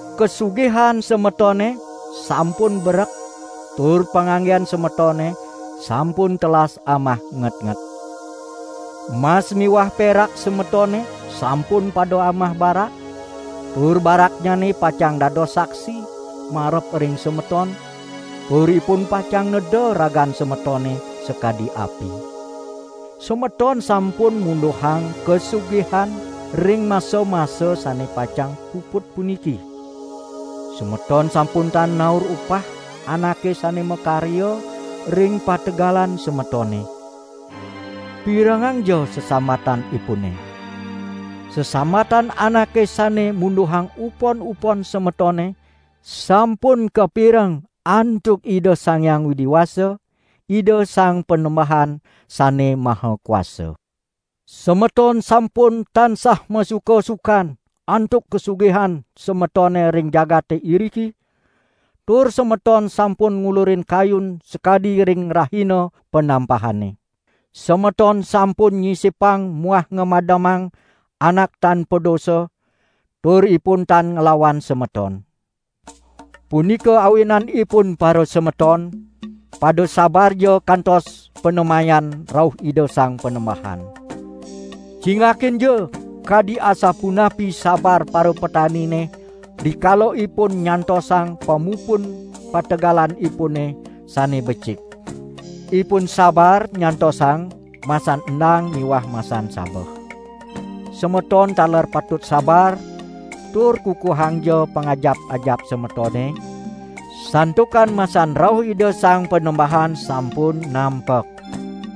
Kasugihan semetone sampun berek tur panganggen semetone sampun telas amah ngetnget. Mas miwah perak semetone sampun pada amah barak, tur baraknyane pacang dados saksi marep ring semeton, tur ipun pacang neda ragan semetone sakadi api. Semeton sampun munduhang kasugihan ring masa-masa sane pacang puput puniki. Semeton sampun tan naur upah anake sane makarya ring pategalan semetone. Pirengangja sesambatanipune. Sesambatan anake sane munduhang upon-upon semetone sampun kapireng antuk Ida Sang Hyang Widi Wasa, Ida Sang Panembahan Sane Maha Kuasa. Semeton sampun tansah masuka-sukan antuk kasugihan semetone ring jagate iriki, tur semeton sampun ngulurin kayun sakadi ring rahina panampahane. Semeton sampun nyisipang muah ngamademang anak tan padosa tur ipun tan nglawan semeton. Punika awinanipun parasemeton, pada sabarja kantos panemayan rauh Ida Sang Panembahan. Cingakinja, kadi asapunapi sabar parapetanine rikala ipun nyantosang pamupun pategalanipune sane becik. Ipun sabar nyantosang masan endang miwah masan sabeh. Semeton taler patut sabar tur kukuhangja pangajap-ajap semetone, santukan masan rauh Ida Sang Panembahan sampun nampek.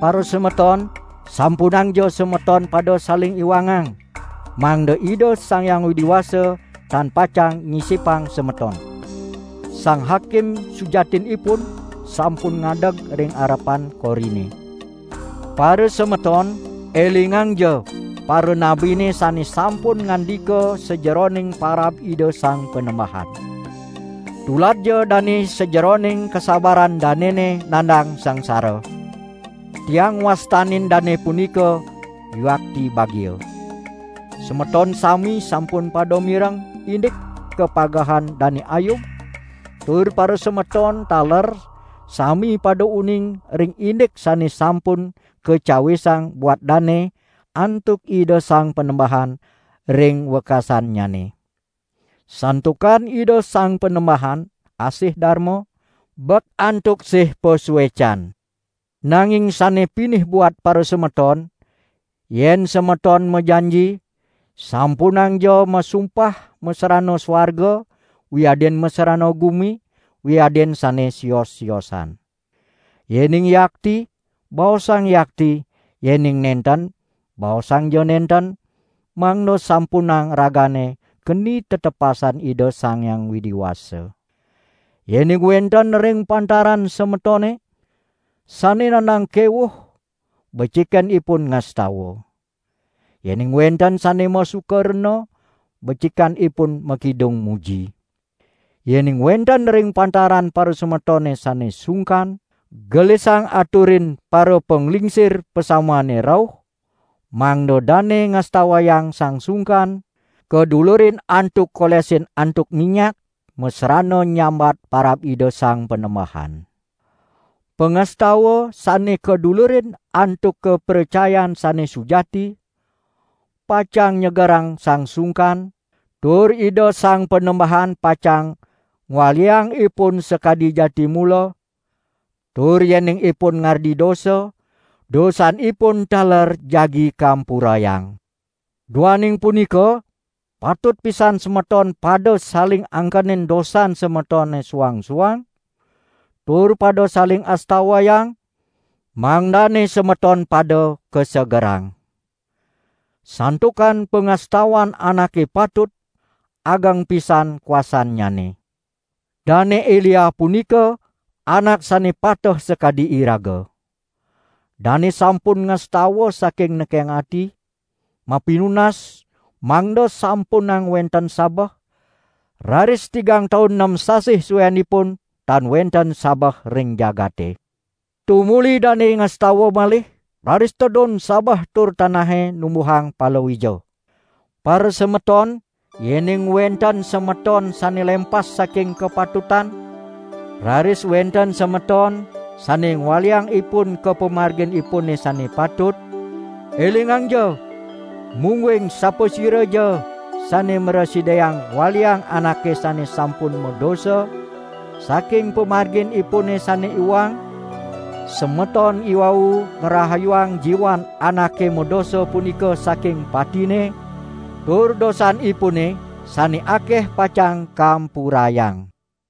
Parasemeton, sampunangja semeton pada saling iwangang, mangda Ida Sang Hyang Widi Wasa tan pacang nyisipang semeton. Sang Hakim sujatinipun sampun ngadeg ring arepan korine. Parasemeton, elingangja paranabine sane sampun ngandika sajeroning parab Ida Sang Panembahan. Tuladja dane sajeroning kasabaran danene nandang sangsara. Tiang ngwastanin dane punika, yuakti bagia. Semeton sami sampun pada mireng indik kapagehan Dane Ayub tur parasemeton taler sami pada uning ring indik sane sampun kacawisang buat dane antuk Ida Sang Panembahan ring wekasannyane. Santukan Ida Sang Panembahan asih darma, bek antuk sih pasuecan. Nanging sane pinih buat parasemeton, yen semeton majanji, sampunangja masumpah masrana suarga wiadin masrana gumi wiadin sane sios-siosan. Yening yakti, baosang yakti, yening nenten, baosangja nenten, mangda sampunang ragane keni tetepasan Ida Sang Hyang Widi Wasa. Yening wenten ring pantaran semetone, sane nandang kewuh becikan ipun ngastawa! Yening wenten sane masuka rena becikan ipun makidung muji. Yening wenten ring pantaran parasemetone sane sungkan, gelisang aturin parapanglingsir pasamuane rauh, mangda dane ngastawayang sang sungkan, kadulurin antuk kolesin antuk minyak masrana nyambat parab Ida Sang Panembahan. Pangastawa sane kadulurin antuk kapracayan sane sujati pacang nyegerang sang sungkan, tur Ida Sang Panembahan pacang ngwaliang ipun sakadi jati mula; tur yening ipun ngardi dosa, dosanipun taler jagi kampurayang. Duaning punika, patut pisan semeton pada saling angkenin dosan semetone suang-suang, tur pada saling astawayang, mangdane semeton pada kasegerang. Santukan pangastawan anake patut, ageng pisan kuasannyane. Dane Elia punika anak sane pateh sakadi iraga. Dane sampun ngastawa saking nekeng ati, mapinunas mangda sampunang wenten sabeh, raris tigang taun nem sasih suenipun tan wenten sabeh ring jagate. Tumuli dane ngastawa malih, raris tedun sabeh tur tanahe numbuhang palawija. Parasemeton, yening wenten semeton sane lempas saking kapatutan, raris wenten semeton sane ngwaliang ipun ka pamarginipune sane patut, elingangja, mungguing sapasiraja sane mrasidayang ngwaliang anake sane sampun madosa, saking pamargin ipune sane iwang, semeton iwau ngrahayuang jiwan anake madosa punika saking patine, tur dosanipune sane akeh pacang kampurayang.